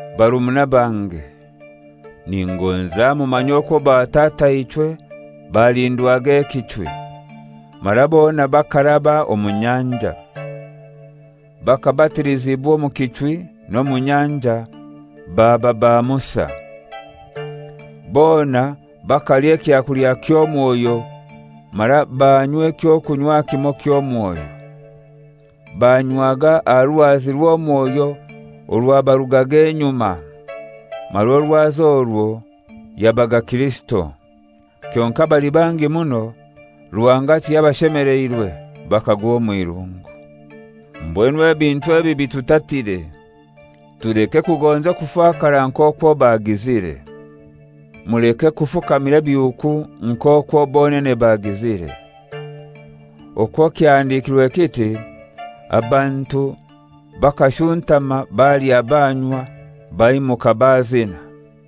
Barumuna bange, ningoza mumanye okwo batataichwe balindwaga ekichwi, mara bona bakaraba omu nyanja. Bakabatilizibwa omu kichwi n'omu nyanja, baba ba Musa. Bona bakalya ekyakulya ky'omwoyo, mara banywa eky'okunywa kimoi ky'omwoyo. Banywaga aha Rwazi rw'omwoyo orwabarugaga enyuma, mara orwazi orwo yabaga Kirisito. Kyonkai abali bangi muno Ruhanga tiyabashemeleirwe, bakagwa omw'irungu. Mbwenu ebintu ebi bitutatire, tuleke kugonza okufakara nk'okwo bagizire. Muleke kufukamira ebihuuku nk'okwo bonene bagizire. Okwo kyahandikirwe kiti, «Abantu bakashuntama balya banywa, baimuka bazina.»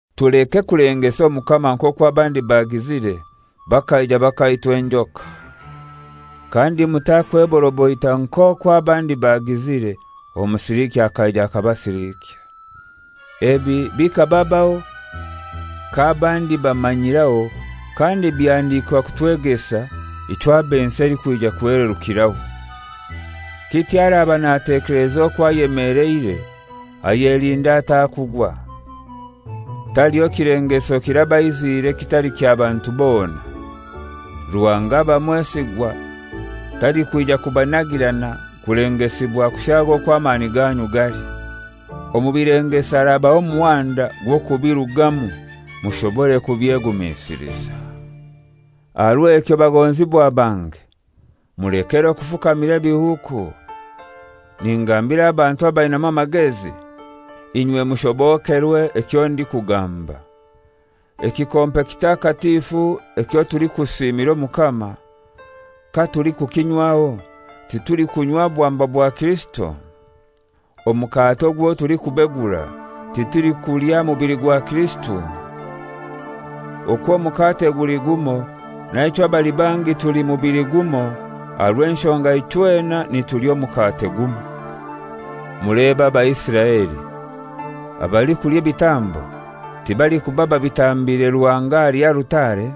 Tuleke kulengesa Omukama nk'okwo abandi bagizire bakaija bakaitwa enjoka. Kandi mutakweboroboita nk'okwo abandi bagizire, omusiliikya akaija akabasilikya. Ebi bikababaho k'abandi bamanyiraho, kandi byahandikwa kutwegesa ab'ensi elikwija kuhelerukiraho. Kityo araba natekeleza okwo ayemeleire ayelinde atakugwa. Taliho kilengeso kirabaiziire ekitali kya bantu bona. Ruhanga aba mwesigwa, talikwija kubanagirana kulengesibwa kushaaga okwo amani ganyu gali. Omu bilengeso arabaha omuhanda gw'okubirugamu, mushobore kubyegumisiliza. Aha rw'ekyo bagonzibwa bange, mulekere okufukamira ebihuuku. Ningambira abantu abainamu amagezi; inywe mushobokerwe ekyo ndikugamba. Ekikompe kitakatifu ekyo tulikusiimira Omukama: katulikukinywaho titulikunywa bwamba bwa Kirisito? Omukate ogwo tulikubegura, titulikulya mubili gwa Kirisito? Okw'omukate guli gumoi, naichwe abali bangi tuli mubili gumoi aha rw'enshonga ichwena nitulya omukate gumoi. Mulebe Abaisiraeli: Abalikulya ebitambo tibalikuba babitambiire Ruhanga ahali alutare?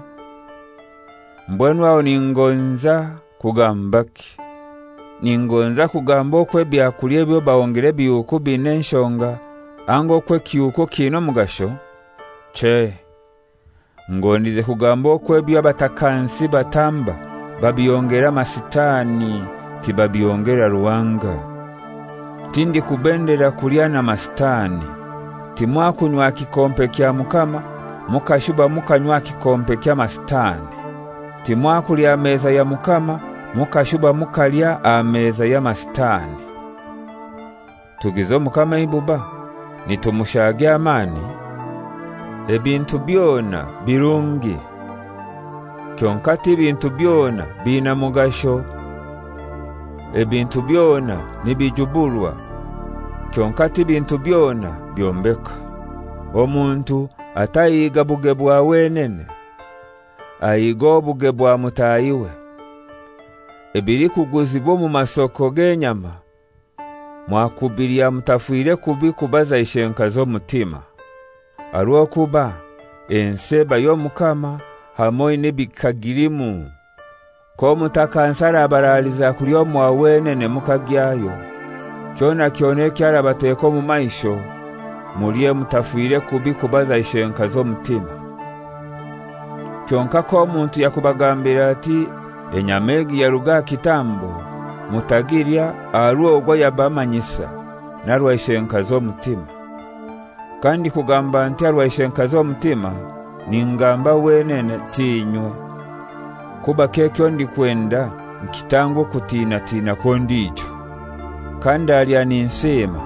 Mbwenu aho ningonza kugambaki? Ningonza kugamba okwo ebyakulya ebyo bahongera ebihuuku bin'enshonga, anga okwo ekihuuku kiina omugasho? Chei, ngondize kugamba okwo ebyo abatakansi batamba babihongera amasitani, tibabihongera Ruhanga. Tindikubendera kulya na masitani. Timwakunywa aha kikompe kya Mukama mukashuba mukanywa aha kikompe ky'amasitani. Timwakulya aha meza ya Mukama mukashuba mukalya aha meza y'amasitani. Tugize Omukama eibuba? Nitumushaagya amani? «Ebintu byona birungi,» kyonkai ti bintu byona biina mugasho. Ebintu byona nibijuburwa, kyonkai ti bintu byona byombeka. Omuntu atahiiga buge bwa wenene, ahiige obuge bwa mutahiwe. Ebilikuguzibwa omu masoko g'enyama mwakubilya mutafire kubi kubaza ishenkazi omutima. Aha rw'okuba «Ensi eba y'Omukama hamoi n'ebikagilimu.» K'omutakansi arabaraliza kulya omwa wenene mukagyayo, kyona kyona ekyo arabateka omu maisho mulye mutafire kubi kubaza ishenkazi omutima. (Kyonkai k'omuntu yakubagambira ati, «Enyama egi yaruga aha kitambo,» mutagilya aha rw'ogwo ayabamanyisa, n'aha rwa ishenkazi omutima. Kandikugamba nti, «Aha rwa ishenkazi omutima» ningamba wenene, t'inywe). Kubaki ekyo ndikwenda nkitangwe okutinatina kw'ondijo? Kandalya ninsiima,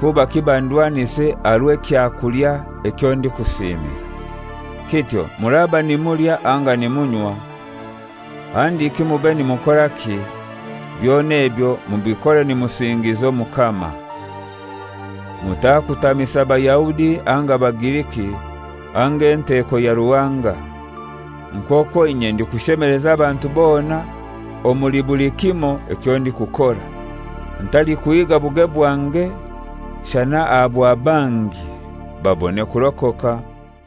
kubaki bandwanise aha rw'ekyakulya ekyo ndikusiimira? Kityo muraba nimulya anga nimunywa, handiki mube nimukoraki, byona ebyo mubikore nimusingiza Omukama. Mutakutamisa Bayahudi anga Bagiriki anga enteko ya Ruhanga, nk'okwo inye ndikushemeleza abantu bona omuli buli kimoi ekyo ndikukora, ntalikuhiga buge bwange shana aha bwa bangi, babone kurokoka.